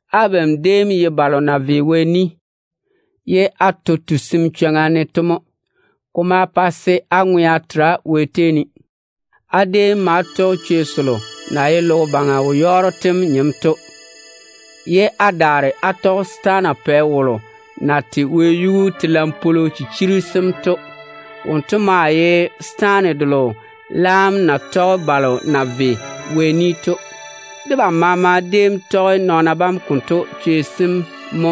Abam déem ye balo na ve Wɛ ni, ye á to tusim chwoŋa ne to mo. Ko ma pa se á ŋwea tera Wɛ tei ne. Á déem ma tɔge chwei selo na ye logo baŋa wo-yɔɔro tem nyem to, ye á daare á tɔge setaana pɛ wolo na tei wɛyuu telaŋ-pwolo chichiri sem to. Wonto maa ye setaane delo laam na tei balo na ve Wɛ ni to. Debam maama déem tɔge nɔɔna bam konto chwei sem mo,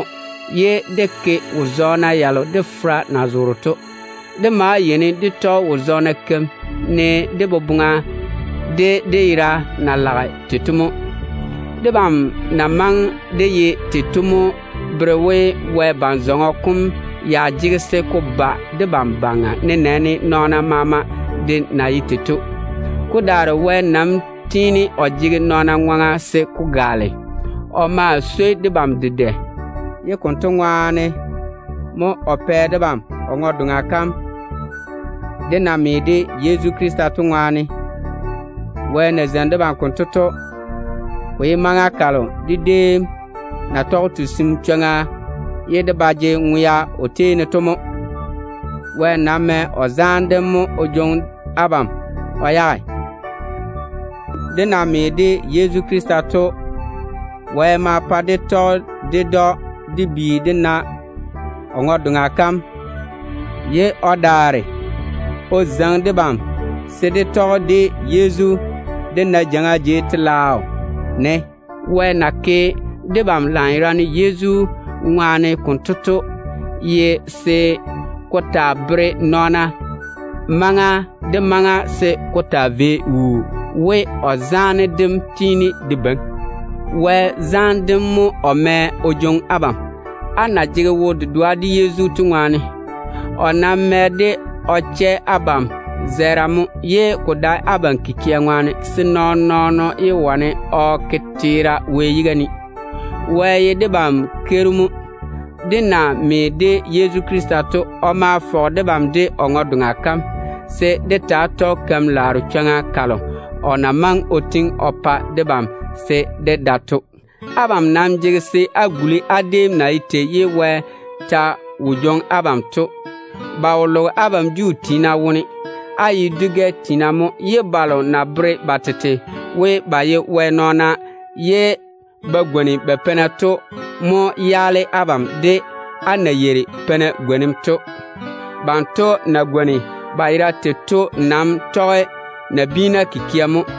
ye dé ke wo-zɔɔna yalo dé fera na zoore to. Dé ma yeini dé tɔge wo-zɔɔna keim, ne dé boboŋa de dé yera na lage tei to mo. Debam na maŋe dé ye tei to mo bere we, Wɛ ban-zɔŋɔ kom ya jege se ko ba debam baŋa, nenɛɛne nɔɔna badaara de na ye tei to. Ko daare Wɛ nam tiini o jege nɔɔna ŋwaŋa se ko gaale. O maa tiini o swoi debam dedɛ. Konto ŋwaane mo o pɛ debam o ŋwe-doŋa kam, dé na me de Yezu Krista to ŋwaane. Wɛ na zeini debam konto to, ko ye maŋa kalo dé déem na tɔge tusim chwoŋa ye dé ba jege ŋwea o tei ne to mo. Wɛ nam mɛ o zaane dem mo o jwoŋi abam o yage. Dé na me de Yezu Krista to, Wɛ ma pa dé tɔge ded‑o dé bi dé na o ŋwe-doŋa kam, ye o daare o zeiŋi debam se dé tɔge de Yezu dé na jeiŋa jei telaao ne. Wɛ na ke debam lanyerane Yezu ŋwaane konto to ye se ko taa bere nɔɔna maŋa maama se ko taa vei wuu we, o zaane dem tiini de beiŋi. Wɛ zaane dem mo o mɛ o jwoŋi abam o yage, á na jege wo-dedoa de Yezu to ŋwaane. O nam tɔge de ŋwaane o chɛ abam zɛɛra mo, ye ko dae abam kikia ŋwaane, se nɔɔn-nɔɔno yé wane o ke teera Wɛ yiga ne. Wɛ ye debam Keiru mo. Dé na me de Yezu Krista to, o ma fɔge debam de o ŋwe-doŋa kam, se dé taa tɔge keim-laaro chwoŋa kalo o na maŋe o tiŋi o pa debam se dé da to. Abam nam jege se á guli á déem na ye tei ye Wɛ ta wo jwoŋi abam to. Ba wo loge abam Juu tiina wone. Á ye dwi-gɛ tiina mo. Balo na bere ba tete we ba ye Wɛ nɔɔna ye ba gwoni ba peina to mo yaale abam de á na yeiri peina gwonim to. Banto na gwoni ba yera tei to nam tɔge nabiina kikia mo.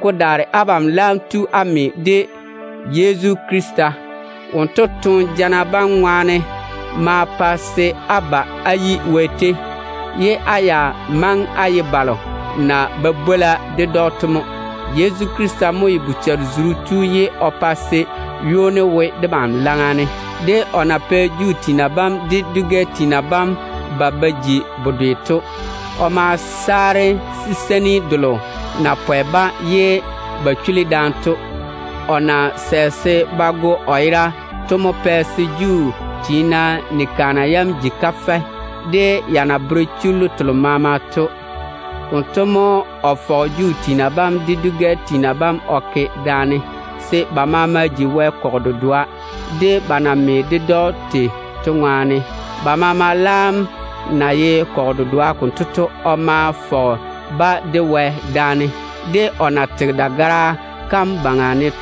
Ko daare abam laam tu á me de Yezu Krista. Wonto toone jana bam ŋwaane ma pa se á ba á yi Wɛ tei, ye á ya maŋe á ye balo na ye yiga yiga ded‑o to mo. Yezu Krista mo ye bochare-zuru tu ye o pa se ywoni wo debam laŋa ne, de o na pɛ Juu tiina bam de dwi-gɛ tiina bam ba ba ji bedwe to. O ma saare siseini delo na pwɛ-ba ye ba chuli daane to. O na sɛ se ba go o yera to mo pɛ se Juu tiina ni-kaana yam ji kafɛ, de ya na bere chullu telo maama to. Konto baŋa ne mo o fɔge Juu tiina bam de dwi-gɛ tiina bam o ke daane, se ba maama ji Wɛ kɔgɔ dedoa, ba na me ded‑o to ŋwaane. Ba maama na ye kɔgɔ dedoa konto to, o ma fɔge ba de Wɛ daane. O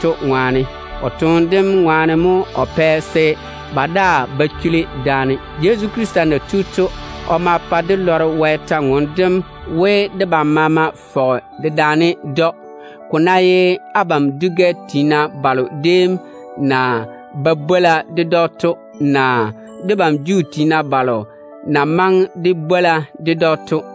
tɔge o toone dem dagara yuu ne ŋwaane mo o pa se ba daa ba chuli daane. Yezu Krista na tu to, o ma pa dé lɔre Wɛ kwor-ywoŋa kam we, debam maama fɔge daane, ko ná ye abam dwi-gɛ tiina balo déem na ye yiga yiga ded‑o to, naa debam Juu tiina balo na maŋe dé bwola ded‑o to de.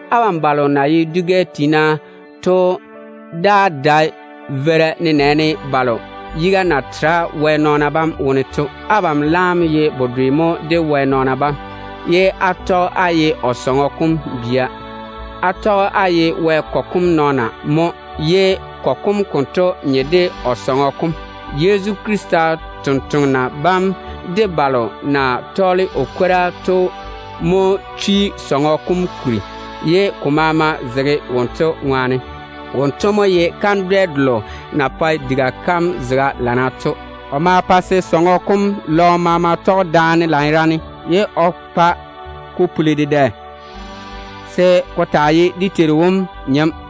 Abam balo na ye dwi-gɛ tiina to daa dae veira, nenɛɛne balo yiga na tera Wɛ nɔɔna bam wone to. Abam laam ye tembia mo Wɛ nɔɔna bam wone, ye á tɔge á ye Wɛ sɔŋɔ kom bia. Á tɔge á ye Wɛ kɔgɔ kom nɔɔna mo, ye kɔgɔ kom konto nye de o tete sɔŋɔ kom. Yezu Krista totoŋa nakwa bam de Wɛ sampwori sem mo chwi sɔŋɔ kom kuri, ye ko maama zege Yezu ŋwaane. Wonto mo ye kandwɛ-zane delo na pae diga kam zega dana to. O maa pae se sɔŋɔ kom lɔɔm maama tɔge daane lanyerane, ye o pa ko puli dedɛ se ko taa ye dé Teiru wom wara-jei.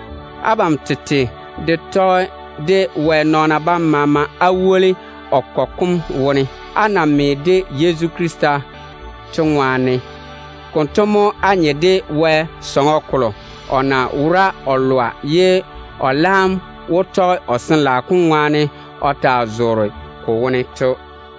Abam tete de tɔge de Wɛ nɔɔna bam maama á woli o kɔgɔ kom wone, á na me de Yezu to ŋwaane. Konto mo á nye de Wɛ sɔŋɔ kolo o na wora o lɔa, ye o laam wó tɔge o Sin-laao kom ŋwaane o taa zoore ko wone to.